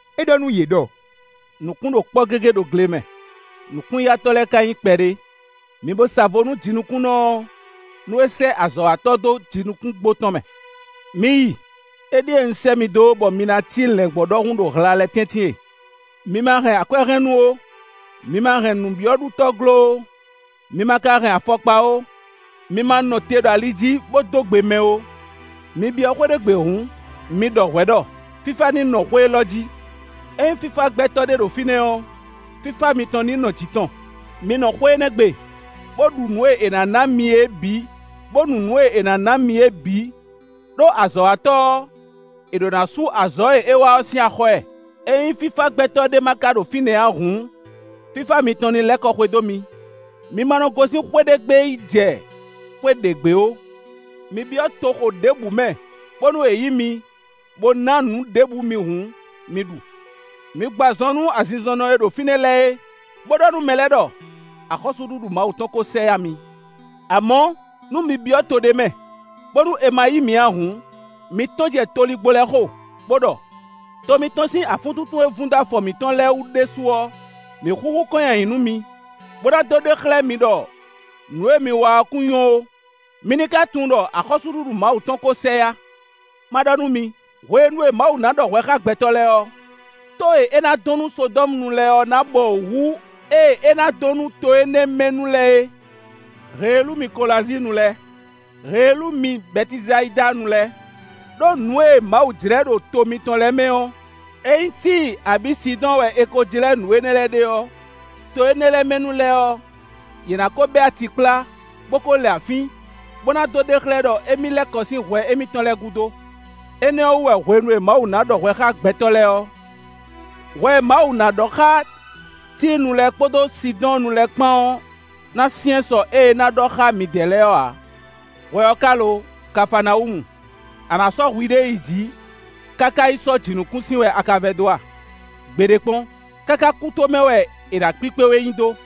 É ɖɔ nú yě ɖɔ: “Nǔkún ɖo kpɔ́ gégé ɖo gle mɛ, nǔkún-yatɔ́ lɛ́ɛ ká nyí kpɛɖé; mi bó sa vo nú jinukúnnɔ ɔ́, nú é sɛ́ azɔ̌watɔ́ dó jinukúngbo tɔn mɛ. Mi yi! Éɖíe un sɛ́ mi dó, bɔ mi ná cí lɛ̌ngbɔ́ ɖɔhun ɖo hla lɛ́ɛ tɛ́ntin e. Mi ma hɛn akwɛ́hɛnnú ó, mi ma hɛn nǔbyɔ́ɖutɔ́glo ó, mi ma ka hɛn afɔkpa ó, mi ma nɔ te ɖo ali jí, bó dó gbe mɛ ó. Mi byɔ́ xwé ɖé gbe hǔn, mi ɖɔ hwɛ̌ ɖɔ: ‘Fífá ní nɔ xwé élɔ́ jí.’ Ényí fífá gbɛtɔ́ ɖé ɖo fínɛ́ ɔ́, fífá mitɔn ní nɔ jǐ tɔn; mi nɔ xwé énɛ́ gbe, bó ɖu nǔ e è nǎ ná mi é bǐ, bó nu nǔ e è nǎ ná mi é bǐ, ɖó azɔ̌watɔ́ ɔ́, è ɖǒ ná sú azɔ̌ e é wa ɔ́ sín axɔ́ ɛ. Ényí fífá gbɛtɔ́ ɖé ma ka ɖo fínɛ́ ǎ hǔn, fífá mitɔn ní lɛ́ kɔ xwedó mi. Mi ma nɔ gosín xwé ɖé gbe yi jɛ xwé ɖě gbe ó. Mi byɔ́ toxo ɖěbǔ mɛ bónú è yí mi, bó na nǔ ɖěbǔ mi hǔn, mi ɖu. Mi gbɔ azɔn nú azinzɔnnɔ e ɖo fínɛ́ lɛ́ɛ é, bó ɖɔ nú mɛ lɛ́ɛ ɖɔ: ‘Axɔ́súɖuɖu Mawu tɔn ko sɛ yá mi.’ Amɔ̌, nú mi byɔ́ to ɖé mɛ, bónú è ma yí mi ǎ hǔn, mi tɔ́n jɛ toligbó lɛ́ɛ xo, bó ɖɔ: ‘To mitɔn sín afúntúntún e vun dó afɔ mǐtɔn lɛ́ɛ wú ɖésú ɔ́, mǐ xúxú kɔn nyi ayǐ nú mi, bó ná dó ɖe xlɛ́ mi ɖɔ nǔ e mi wa ɔ́ kún nyɔ́ ó. Mi ní ka tunwun ɖɔ axɔ́súɖuɖu Mawu tɔn ko sɛ yá.’ Ma ɖɔ nú mi: hwenu e Mawu ná ɖɔ hwɛ xá gbɛtɔ́ lɛ́ɛ ɔ́, tó e è nǎ dɔn nú Sodɔ́munu lɛ́ɛ ɔ́ ná bɔwǔ hú ée è nǎ dɔn nú to énɛ́ mɛ nu lɛ́ɛ é.” “Heelú mi Kolazíinnu lɛ́ɛ! Heelú mi Bɛtisayidanu lɛ́ɛ! Đó nǔ e Mawu jlɛ ɖo to mitɔn lɛ́ɛ mɛ ɔ́, ényí Tíi abǐ Sidɔ́ɔn wɛ è ko jlɛ́ nǔ énɛ́ lɛ́ɛ ɖe ɔ́, to énɛ́ lɛ́ɛ mɛ nu lɛ́ɛ ɔ́, yě ná ko bɛ́ ati kplá, bó kó lɛ afín, bó ná dó ɖe xlɛ́ ɖɔ émí lɛ́ kɔ sín hwɛ émítɔn lɛ́ɛ gúdo. Énɛ́ ɔ́ wú wɛ hwenu e Mawu ná ɖɔ hwɛ xá gbɛtɔ́ lɛ́ɛ ɔ́, hwɛ e Mawu ná ɖɔ xá Tíinu lɛ́ɛ kpódó Sidɔ́ɔnnu lɛ́ɛ kpán ɔ́ ná syɛ́n sɔ́ ée é ná ɖɔ xá midɛɛ lɛ́ɛ ɔ́ ǎ. Hwɛ ɔ́ ka lo Kafaanawúmu! A nǎ sɔ́ hwiɖée yi jǐ káká yi sɔ́ jǐnukúnsin wɛ a ka vɛdó a? Gbeɖé kpɔ́n; káká kútomɛ wɛ è nǎ kpíkpé we nyi dó.”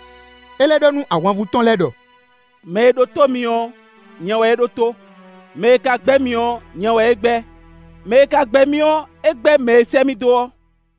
É lɛ́ ɖɔ nú ahwanvú tɔn lɛ́ɛ ɖɔ: “Mɛ e ɖótó mi ɔ́, nyɛ wɛ é ɖótó; mɛ e ka gbɛ́ mi ɔ́, nyɛ wɛ é gbɛ́. Mɛ e ka gbɛ́ mì ɔ́, é gbɛ́ mɛ e sɛ́ mì dó ɔ́.”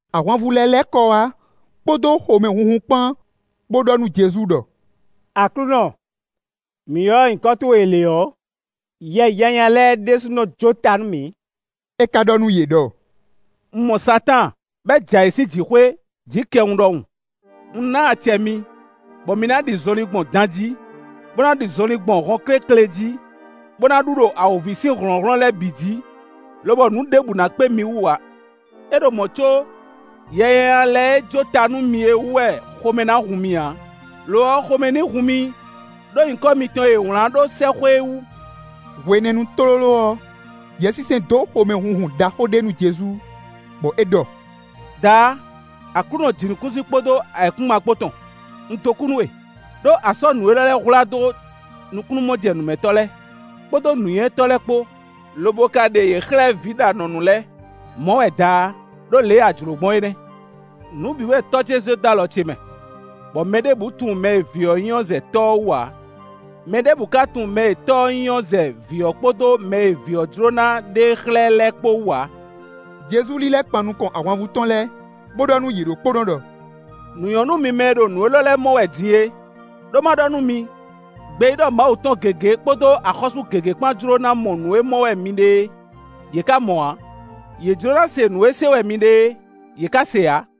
Ahwanvú lɛ́ɛ lɛ́ kɔ wá kpódó xomɛhunhun kpán, bó ɖɔ nú Jezu ɖɔ: “Aklúnɔ, mǐ ylɔ́ nyǐkɔ towe lě ɔ́, yɛ nyanya lɛ́ɛ ɖésú nɔ jó ta nú mǐ.” É ka ɖɔ nú yě ɖɔ: “Un mɔ Satáan, bɔ é jɛ ayǐ sín jǐxwé, jǐkɛwun ɖɔhun. Un ná acɛ mi, bɔ mi ná ɖi zɔnlin gbɔn dan jí, bó ná ɖi zɔnlin gbɔn hɔnkéklě jí, bó ná ɖu ɖo awǒvi sín hlɔ̌nhlɔ́n lɛ́ɛ bǐ jí, lobɔ nǔ ɖěbǔ ná kpé mi wú ǎ. É ɖo mɔ̌ có, yɛ nyanya lɛ́ɛ e jó ta nú mi é wú wɛ xomɛ ná hun mi ǎ; lo ɔ́, xomɛ ní hun mi ɖó nyǐkɔ mitɔn e è wlǎn ɖó sɛ́xwé é wú.” Hwenɛ́nu tlóló ɔ́, Yɛsinsɛn dó xomɛ hunhun ɖaxó ɖé nú Jezu, bɔ é ɖɔ: “Daá! Aklúnɔ jǐnukúnsin kpódó ayǐkúngban kpó tɔn, un dó kú nú we, ɖó a sɔ́ nǔ énɛ́ lɛ́ɛ hwlá dó nukúnnú-mɔjɛ́nǔmɛtɔ́ lɛ́ɛ, kpódó nǔnywɛ́tɔ́ lɛ́ɛ kpó, lobo ka ɖe yě xlɛ́ vǐ ɖo anɔ̌nu lɛ́ɛ. Mɔ̌ wɛ Daá! Đó lě e a jlǒ gbɔn é nɛ́. “Nǔ bǐ wɛ Tɔ́ ce sɔ́ dó alɔ ce mɛ, bɔ mɛ ɖěbǔ tunwun mɛ e Vǐ ɔ́ nyí ɔ́ zɛ Tɔ́ ɔ́ wú ǎ; mɛ ɖěbǔ ká tunwun mɛ e Tɔ́ ɔ́ nyí ɔ́ zɛ Vǐ ɔ́ kpódó mɛ e Vǐ ɔ́ jló ná ɖe e xlɛ́ lɛ́ɛ kpó wú ǎ.” Jezu lílɛ́ kpan nukɔn ahwanvú tɔn lɛ́ɛ, bó ɖɔ nú yě ɖokpónɔ ɖɔ: “Nǔ nyɔ́ nú mi mɛ e ɖo nǔ élɔ́ lɛ́ɛ mɔ wɛ din é! Đó má ɖɔ nú mi: gbeyíɖɔ Mawu tɔn gěgé kpódó axɔ́sú gěgé kpán jló ná mɔ nǔ e mɔ wɛ mi ɖe é; yě ká mɔ ǎ; yě jló ná se nǔ e se wɛ mi ɖe é, yě ká se ǎ.”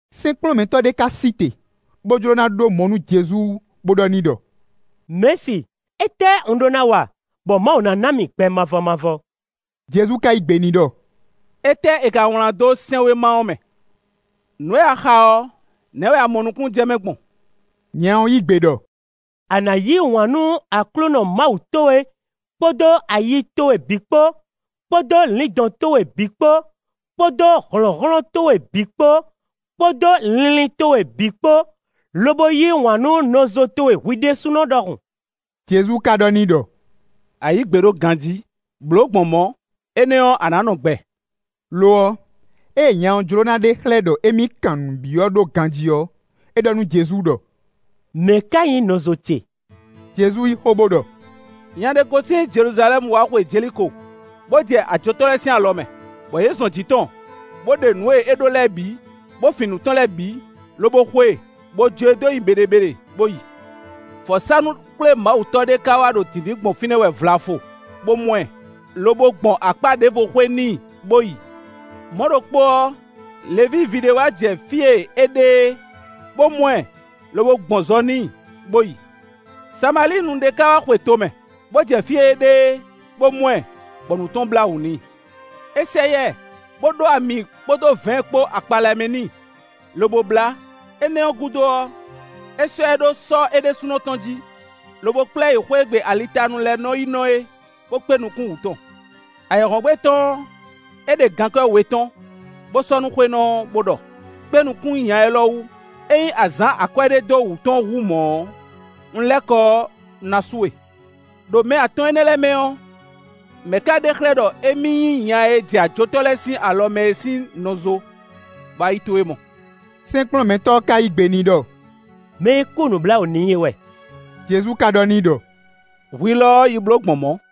Sɛ́nkplɔ́nmɛtɔ́ ɖé ka sí te, bó jló ná ɖó mɔ nú Jezu, bó ɖɔ n'i ɖɔ: “Mɛ̌si, étɛ́ un ɖó ná wa, bɔ Mawu ná ná mì gbɛ mavɔ mavɔ?” Jezu ka yí gbe n'i ɖɔ: “Étɛ́ è ka wlán dó sɛ́nwéma ɔ́ mɛ? Nǔ e a xa ɔ́, nɛ̌ wɛ a mɔ nukúnnú jɛ mɛ gbɔn?” Nya ɔ́ yí gbe ɖɔ: “A nǎ yí wǎn nú Aklúnɔ Mawu towe kpódó ayi towe bǐ kpó, kpódó lǐndɔ̌n towe bǐ kpó, kpódó hlɔ̌nhlɔ́n towe bǐ kpó, kpódó linlin towe bǐ kpó, lobo yí wǎn nú nɔzo towe hwi ɖésúnɔ ɖɔhun.” Jezu ka ɖɔ n'i ɖɔ: “A yǐ gbe ɖó ganjí. Blǒ gbɔn mɔ̌, énɛ́ ɔ́, a nǎ nɔ gbɛ.” Lo ɔ́, ée nya ɔ́ jló ná ɖe xlɛ́ ɖɔ émí kan nǔ byɔ́ ɖó ganjí ɔ́, é ɖɔ nú Jezu ɖɔ: “Mɛ̌ ká nyí nɔzo ce?” Jezu yí xó, bó ɖɔ: “Nya ɖé gosín Jeluzalɛ́mu wá xwe Jeliko, bó jɛ ajotɔ́ lɛ́ɛ sín alɔ mɛ, bɔ yě zɔn jǐ tɔn, bó ɖe nǔ e é dó lɛ́ɛ bǐ, bó fin nǔ tɔn lɛ́ɛ bǐ, lobo xo e, bó jó e dó nyi beɖebeɖe bó yi. Vɔ̌sánú-xwlémawutɔ́ ɖé ka wá ɖo dǐndín gbɔn fínɛ́ wɛ vlafo, bó mɔ ɛ, lobo gbɔn akpá ɖěvo xwé n'i bó yi. Mɔ̌ ɖokpó ɔ́, Levíi ví ɖé wá jɛ fí e é ɖe é, bó mɔ ɛ, lobo gbɔn zɔ n'i bó yi. Samalíinu ɖé ka wá xwe to mɛ, bó jɛ fí e é ɖe é, bó mɔ ɛ, bɔ nǔ tɔn blá wǔ n'i. É sɛ yá ɛ, bó ɖó ami kpódó vɛ̌ɛn kpó akpa lɛ́ɛ mɛ n'i, lobo blá; énɛ́ ɔ́ gúdo ɔ́, é sɔ́ ɛ ɖó sɔ́ é ɖésúnɔ tɔn jí, lobo kplá ɛ yi xwé e gbe alitanu lɛ́ɛ nɔ́ yi nɔ é, bó kpé nukún wǔ tɔn. Ayǐhɔ́ngbe tɔn ɔ́, é ɖe gankwɛ́ we tɔ́n, bó sɔ́ nú xwénɔ ɔ́, bó ɖɔ: ‘Kpé nukún nya élɔ́ wú; ényí a zǎn akwɛ́ ɖé dó wǔ tɔn hú mɔ̌ ɔ́, un lɛ́ kɔ ɔ́, un ná sú we.’” “Đo mɛ atɔn énɛ́ lɛ́ɛ mɛ ɔ́, mɛ̌ ká ɖe xlɛ́ ɖɔ émí nyí nya e jɛ ajotɔ́ lɛ́ɛ sín alɔ mɛ é sín nɔzo, bɔ ayi towe mɔ?” Sɛ́nkplɔ́nmɛtɔ́ ɔ́ ka yí gbe n'i ɖɔ: “Mɛ e kú nǔbláwǔ n'i é wɛ.” Jezu ka ɖɔ n'i ɖɔ: “Hwi lɔ ɔ́, yi bló gbɔn mɔ̌.”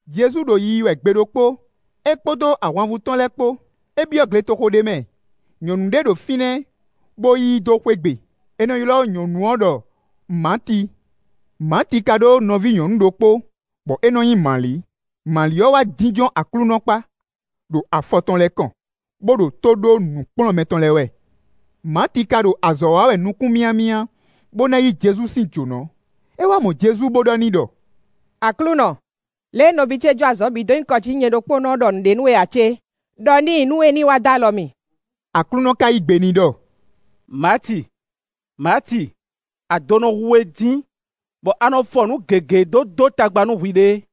Jezu ɖo yiyi wɛ gbe ɖokpó, é kpódó ahwanvú tɔn lɛ́ɛ kpó. É byɔ́ gletoxo ɖé mɛ; nyɔ̌nu ɖé ɖo fínɛ́, bó yí i dó xwé gbe. È nɔ ylɔ́ nyɔ̌nu ɔ́ ɖɔ Maati. Maati ka ɖó nɔví nyɔ̌nu ɖokpó, bɔ é nɔ nyí Mali. Mali ɔ́ wá jínjɔ́n Aklúnɔ kpá, ɖo afɔ tɔn lɛ́ɛ kɔn, bó ɖo tó ɖó nǔkplɔ́nmɛ tɔn lɛ́ɛ wɛ. Maati ka ɖo azɔ̌ wa wɛ nukún myámyá, bó ná yí Jezu sín jǒnɔ. É wá mɔ Jezu bó ɖɔ n'i ɖɔ: “Aklúnɔ, lě e nɔví ce jó azɔ̌ bǐ dó nyi kɔ jí nú nyɛ ɖokpónɔ ɔ́ ɖɔ nǔɖé nú we ǎ cé? Đɔ n'i nú é ní wá dó alɔ mì.” Aklúnɔ ka yí gbe n'i ɖɔ: “Maati, Maati, ado nɔ hu we dín, bɔ a nɔ fɔ nǔ gěgé dó dó tagba nú hwiɖée.